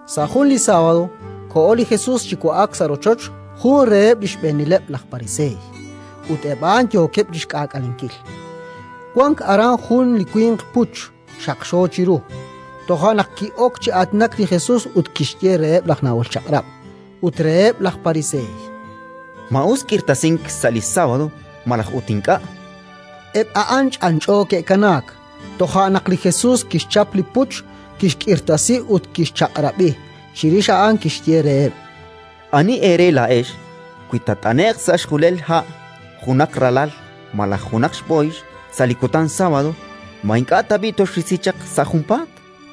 Sa' jun li sábado koho li Jesus chi wa'ak sa' rochoch jun reheb' li xb'eenileb' laj Pariseey, ut eb' a'an yookeb' chi xk'aak'alenkil. Wank aran jun li winq puch, xaqxo chiru. Toja' naq ki'ok chi aatinak li Jesus ut kixye reheb' laj Nahol Chaq'rab' ut reheb' laj Pariseey: —Ma us k'irtasink sa' li sábado malaj ut ink'a'? Eb' a'an ch'anch'o ke'kanaak. Toja' naq li Jesus kixchap li puch, kixk'irtasi ut kixchaq'rab'i; chirix a'an kixye reheb': —Ani eere laa'ex, wi taat'ane'q sa' xjulel ha' junaq ralal malaj junaq xb'ooyx sa' li kutan sábado, ma ink'a' tab'i' toxrisi chaq sa' junpaat?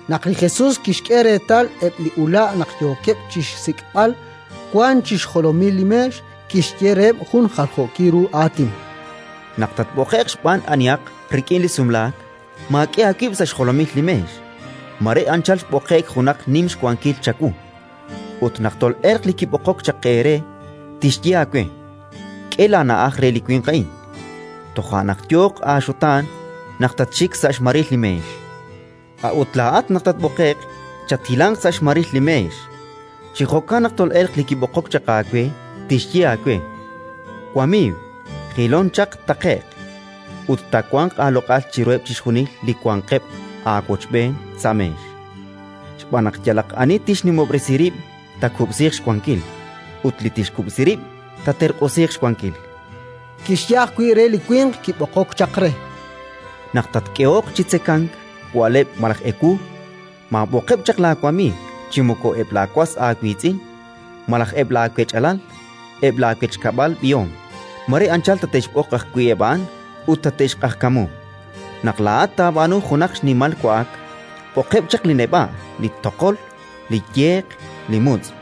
Naq li Jesus kixk'e reetal eb' li ula' naq yookeb' chi xsik'b'al wank chi xjolomil li meex, kixye reheb' jun jaljookil ru aatin: —Naq tatb'oqe'q xb'aan anihaq rik'in li sumlaak, maak'e aawib' sa' xjolomil li meex. Mare anchal xb'oqe'k junaq nim xwankil chawu ut, naq tol'elq li kib'oqok chaq eere, tixye aawe: «K'e laana'aj re li winq a'in». Toja' naq yooq aaxutaan naq tatxik sa' xmaril li meex. A'ut laa'at, naq tatb'oqe'q, chathilanq sa' xmaril li meex; chi jo'kan, naq tol'elq li kib'oqok chaq aawe, tixye aawe: «Wamiiw, jilon chaq taqe'q». Ut taawanq aaloq'al chiruheb' chixjunil li wanqeb' aawochb'een sa' meex. Xb'aan naq yalaq ani tixnimob'resi rib', taakub'siiq xwankil; ut li tixkub'si rib', taaterq'usiiq xwankil. Kixye ajwi' re li winq kib'oqok chaq re: —Naq tatk'ehoq chi tzekank wa'leb' malaj ewu, maab'oqeb' chaq laawamiiw, chi moko eb' laawas aawiitz'in, malaj eb' laawech'alal, eb' laawechkab'al b'ihom. Mare anchal tate'xb'oq ajwi' eb' a'an ut tate'xq'ajkamu. Naq laa'at taab'aanu junaq xnimal wa'ak, b'oqeb' chaq li neb'a', li toqol, li yeq, li mutz',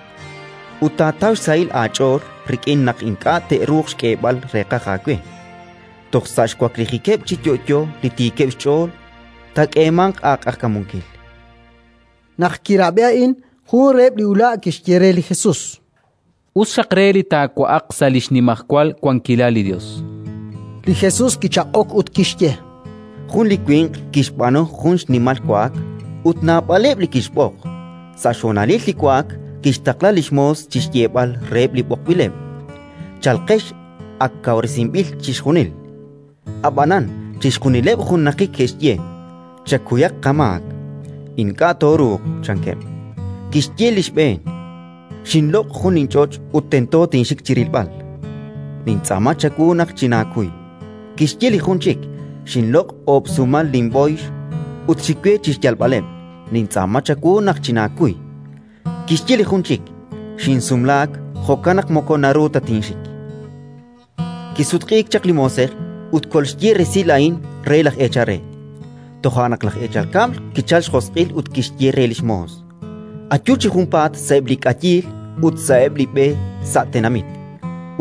ut taataw xsahil aach'ool rik'in naq ink'a' te'ruuq xk'eeb'al reeqaj aawe: toj sa' li xwaklijikeb' chi yo'yo li tiikeb' xch'ool taak'eemanq aaq'ajkamunkil. Naq kirab'i a'in, jun reheb' li ula' kixye re li Jesus: —Us xaq re li taawa'aq sa' li xnimajwal wankilal li Yos. Li Jesus kichaq'ok ut kixye: —Jun li winq kixb'aanu jun xnimal wa'ak, ut naab'aleb' li kixb'oq. Sa' xhonalil li wa'ak kixtaqla li xmoos chi xyeeb'al reheb' li b'oqb'ileb': «Chalqex, ak kawresinb'il chixjunil». Ab'anan chixjunileb' junnaqik ke'xye: «Chakuyaq qamaak. Ink'a' tooruuq», chankeb'. Kixye li xb'een: «Xinloq' jun linch'och' ut tento tinxik chi rilb'al. Nintz'aama chawu naq chinaakuy». Kixye li jun chik: «Xinloq' oob' sumal linb'ooyx ut xik we chi xyalb'aleb'. Nintz'aama chawu naq chinaakuy». Kixye li jun chik: «Xinsumlaak, jo'kan naq moko naru ta tinxik». “Kisutq'iik chaq li moosej ut kolxye resil a'in re laj eechal re. Toja' naq laj eechal kab'l kichalk xjosq'il ut kixye re li xmoos: «Ayu chi junpaat sa'eb' li k'ayiil ut sa'eb' li b'e sa' tenamit,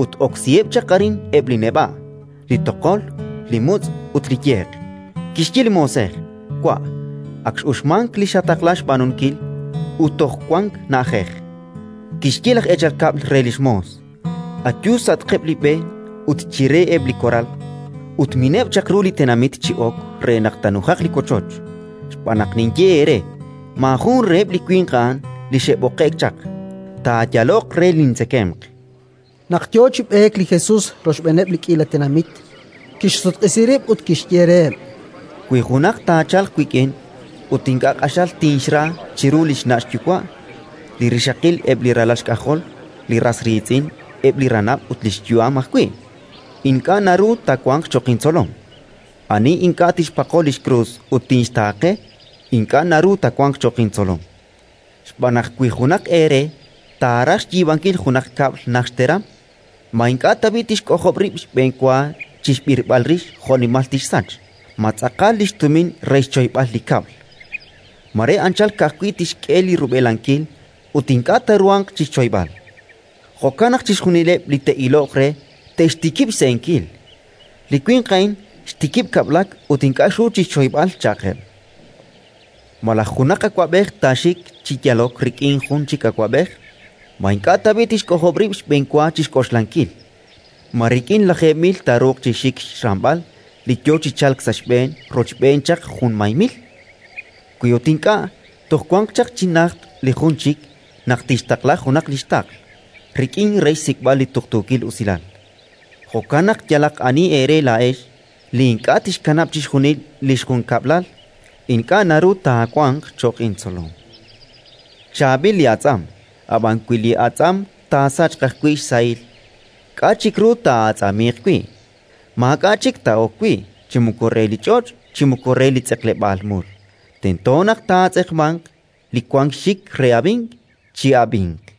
ut oksiheb' chaq arin eb' li neb'a', li toqol, li mutz' ut li yeq». Kixye li moosej: «Wa', ak x'uxmank li xataqla xb'aanunkil, ut toj wank na'ajej». Kixye laj eechal kab'l re li xmoos: «Ayu sa'atqeb' li b'e ut chire eb' li koral, ut mineb' chaq ru li tenamit chi ok re naq taanujaq li wochoch. Xb'aan naq ninye eere: Maajun reheb' li winq a'an li xe'b'oqe'k chaq, taayaloq re lintzekemq». Naq yo chi b'eek li Jesus rochb'eeneb' li k'iila tenamit, kixsutq'isi rib' ut kixye reheb': “Wi junaq taachalq wik'in ut ink'a' q'axal tinxra chiru li xna' xyuwa', li rixaqil, eb' li ralal xk'ajol, li ras riitz'in, eb' li ranab' ut li xyu'am ajwi', ink'a' naru taawanq cho'q intzolom. Ani ink'a' tixpaqo li xkrus ut tinxtaaqe, ink'a' naru taawanq cho'q intzolom. “Xb'aan naq, wi junaq eere taaraj xyiib'ankil junaq kab'l najt xteram, ma ink'a' tab'i' tixk'ojob' rib' xb'enwa chi xb'irb'al rix jo'nimal tixsach: ma tz'aqal li xtumin re xchoyb'al li kab'l? Mare anchal ka'ajwi' tixk'e li rub'elankil, ut ink'a' taaruhanq chi xchoyb'al. Jo'kan naq chixjunileb' li te'iloq re te'xtikib' xse'enkil: «Li winq a'in xtikib' kab'lak ut ink'a' xru chi xchoyb'al», cha'qeb'. “Malaj junaq awab'ej taaxik chi yalok rik'in jun chik awab'ej, ma ink'a' tab'i' tixk'ojob' rib' xb'enwa chi xk'oxlankil: ma rik'in lajeeb' mil taaruuq chi xik xramb'al li yo chi chalk sa' xb'een rochb'een chaq junmay mil? Wi ut ink'a', toj wanq chaq chi najt li jun chik naq tixtaqla junaq li xtaql rik'in re xsik'b'al li tuqtuukil usilal. Jo'kan naq yalaq ani eere laa'ex li ink'a' tixkanab' chixjunil li xjunkab'lal, ink'a' naru taawanq cho'q intzolom. “Chaab'il li atz'am, ab'an wi li atz'am taasachq ajwi' xsahil, k'a' chik ru taa'atz'amiiq wi'? Maak'a' chik taa'ok wi': chi moko re li ch'och' chi moko re li tz'eqleb'aal mul; tento naq taatz'eqmanq. Li wank xxik re ab'ink, chi'ab'inq”.